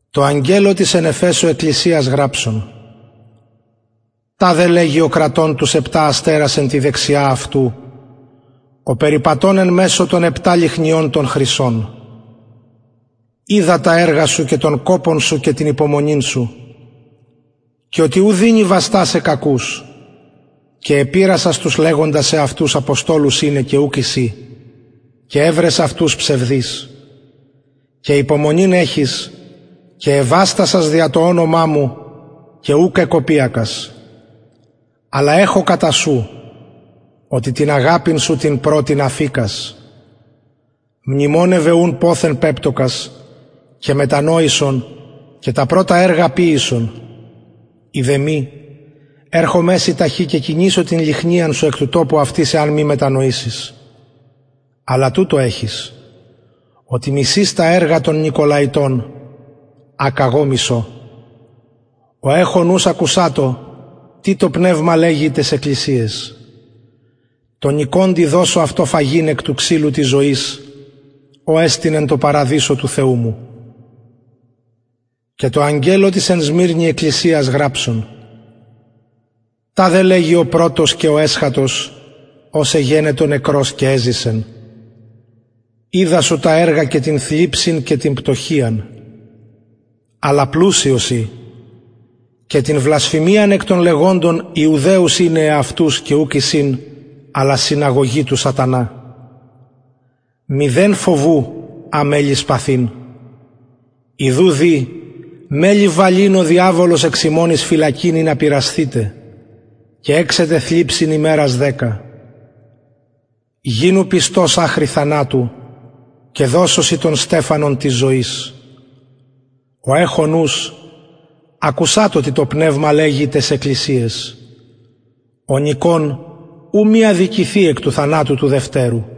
τω αγγελω της εν εφεσω εκκλησιας γραψον ταδε λεγει ο κρατων τους επτα αστερας εν τη δεξια αυτου ο περιπατων εν μεσω των επτα λυχνιων των χρυσων οιδα τα εργα σου και τον κοπον σου και την υπομονην σου και οτι ου δυνη βαστασαι κακους και επειρασας τους λεγοντας εαυτους αποστολους ειναι και ουκ εισιν και ευρες αυτους ψευδεις και υπομονην εχεις και εβαστασας δια το ονομα μου και ουκ εκοπιασας αλλα εχω κατα σου οτι την αγαπην σου την πρωτην αφηκας μνημονευε ουν ποθεν πεπτωκας και μετανοησον και τα πρωτα εργα ποιησον ει δε μη ερχομαι σοι ταχυ και κινησω την λυχνιαν σου εκ του τοπου αυτης εαν μη μετανοησης αλλα τουτο εχεις οτι μισεις τα εργα των νικολαιτων α καγω μισω ο εχων ους ακουσατω τι το πνευμα λεγει ταις εκκλησιαις τω νικωντι δωσω αυτω φαγειν εκ του ξυλου της ζωης ο εστιν εν τω παραδεισω του θεου μου και τω αγγελω της εν σμυρνη εκκλησιας γραψον ταδε λεγει ο πρωτος και ο εσχατος ος εγενετο νεκρος και εζησεν οιδα σου τα εργα και την θλιψιν και την πτωχειαν αλλα πλουσιος ει και την βλασφημιαν εκ των λεγοντων ιουδαιους ειναι εαυτους και ουκ εισιν αλλα συναγωγη του σατανα μηδεν φοβου α μελλεις παθειν ιδου δη μελλει βαλειν ο διαβολος εξ υμων εις φυλακην ινα πειρασθητε και εξετε θλιψιν ημερων δεκα γινου πιστος αχρι θανατου και δωσω σοι τον στεφανον της ζωης ο εχων ους ακουσατω τι το πνευμα λεγει ταις εκκλησιαις ο νικων ου μη αδικηθη εκ του θανατου του δευτερου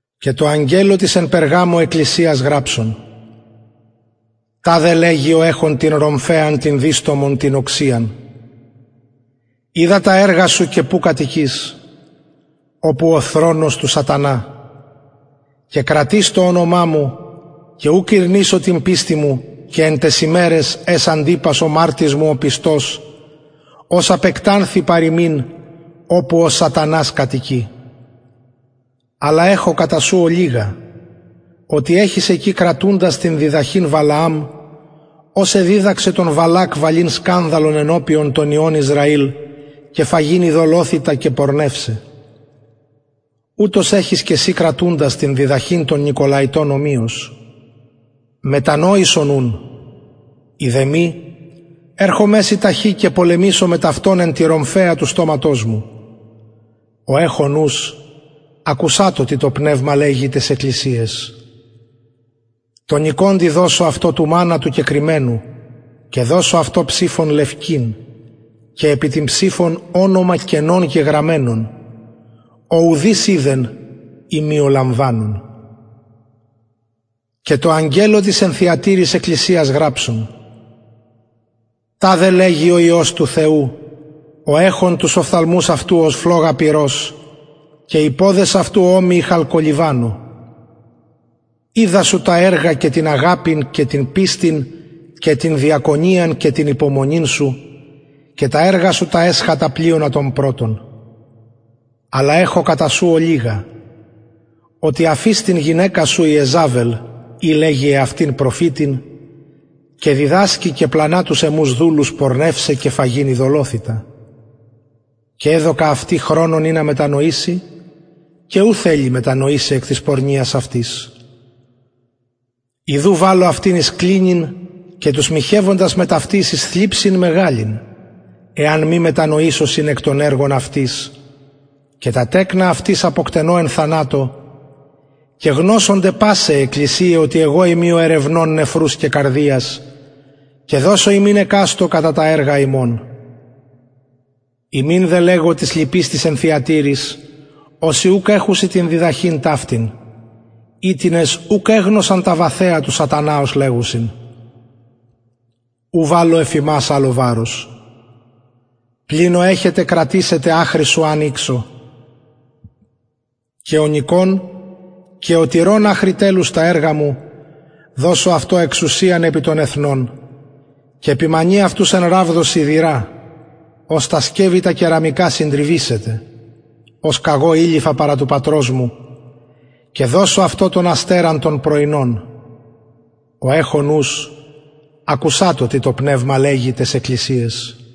και τω αγγελω της εν περγαμω εκκλησιας γραψον ταδε λεγει ο εχων την ρομφαιαν την διστομον την οξειαν οιδα τα εργα σου και που κατοικεις οπου ο θρονος του σατανα και κρατεις το ονομα μου και ουκ ηρνησω την πιστιν μου εν ταις ημεραις εν αις αντιπας ο μαρτυς μου ο πιστος ος απεκτανθη παρ υμιν οπου ο σατανας κατοικει αλλ εχω κατα σου ολιγα οτι εχεις εκει κρατουντας την διδαχην βαλααμ ος εδιδαξεν τον βαλακ βαλειν σκανδαλον ενωπιον των υιων ισραηλ και φαγειν ειδωλοθυτα και πορνευσαι ουτως εχεις και συ κρατουντας την διδαχην των νικολαιτων ομοιως μετανοησον ουν ει δε μη ερχομαι σοι ταχυ και πολεμησω μετ αυτων εν τη ρομφαια του στοματος μου ο εχων ους ακουσατω τι το πνευμα λεγει ταις εκκλησιαις τω νικωντι δωσω αυτω φαγειν του μαννα του κεκρυμμενου και δωσω αυτω ψηφον λευκην και επι την ψηφον ονομα καινον γεγραμμενον ο ουδεις οιδεν ει μη ο λαμβανων και τω αγγελω της εν θυατειροις εκκλησιας γραψον ταδε λεγει ο υιος του θεου ο εχων τους οφθαλμους αυτου ως φλογα πυρος και οι ποδες αυτου ομοιοι χαλκολιβανω οιδα σου τα εργα και την αγαπην και την πιστιν και την διακονιαν και την υπομονην σου και τα εργα σου τα εσχατα πλειονα των πρωτων αλλ εχω κατα σου οτι αφεις την γυναικα σου ιεζαβελ η λεγει εαυτην προφητιν και διδασκει και πλανα τους εμους δουλους πορνευσαι και φαγειν ειδωλοθυτα και εδωκα αυτη χρονον ινα μετανοηση και ου θελει μετανοησαι εκ της πορνειας αυτης ιδου βαλλω αυτην εις κλινην και τους μοιχευοντας μετ αυτης εις θλιψιν μεγαλην εαν μη μετανοησωσιν εκ των εργων αυτης και τα τεκνα αυτης αποκτενω εν θανατω και γνωσονται πασαι αι εκκλησιαι οτι εγω ειμι ο ερευνων νεφρους και καρδιας και δωσω υμιν εκαστω κατα τα εργα υμων υμιν δε λεγω τοις λοιποις τοις εν θυατειροις οσοι ουκ εχουσιν την διδαχην ταυτην οιτινες ουκ εγνωσαν τα βαθεα του σατανα ως λεγουσιν ου βαλλω εφ υμας αλλο βαρος πλην ο εχετε κρατησατε αχρι ου αν ηξω και ο νικων και ο τηρων αχρι τελους τα εργα μου δωσω αυτω εξουσιαν επι των εθνων και ποιμανει αυτους εν ραβδω σιδηρα ως τα σκευη τα κεραμικα συντριβησεται ως καγω ειληφα παρα του πατρος μου και δωσω αυτω τον αστερα τον πρωινον ο εχων ους ακουσατω τι το πνευμα λεγει ταις εκκλησιαις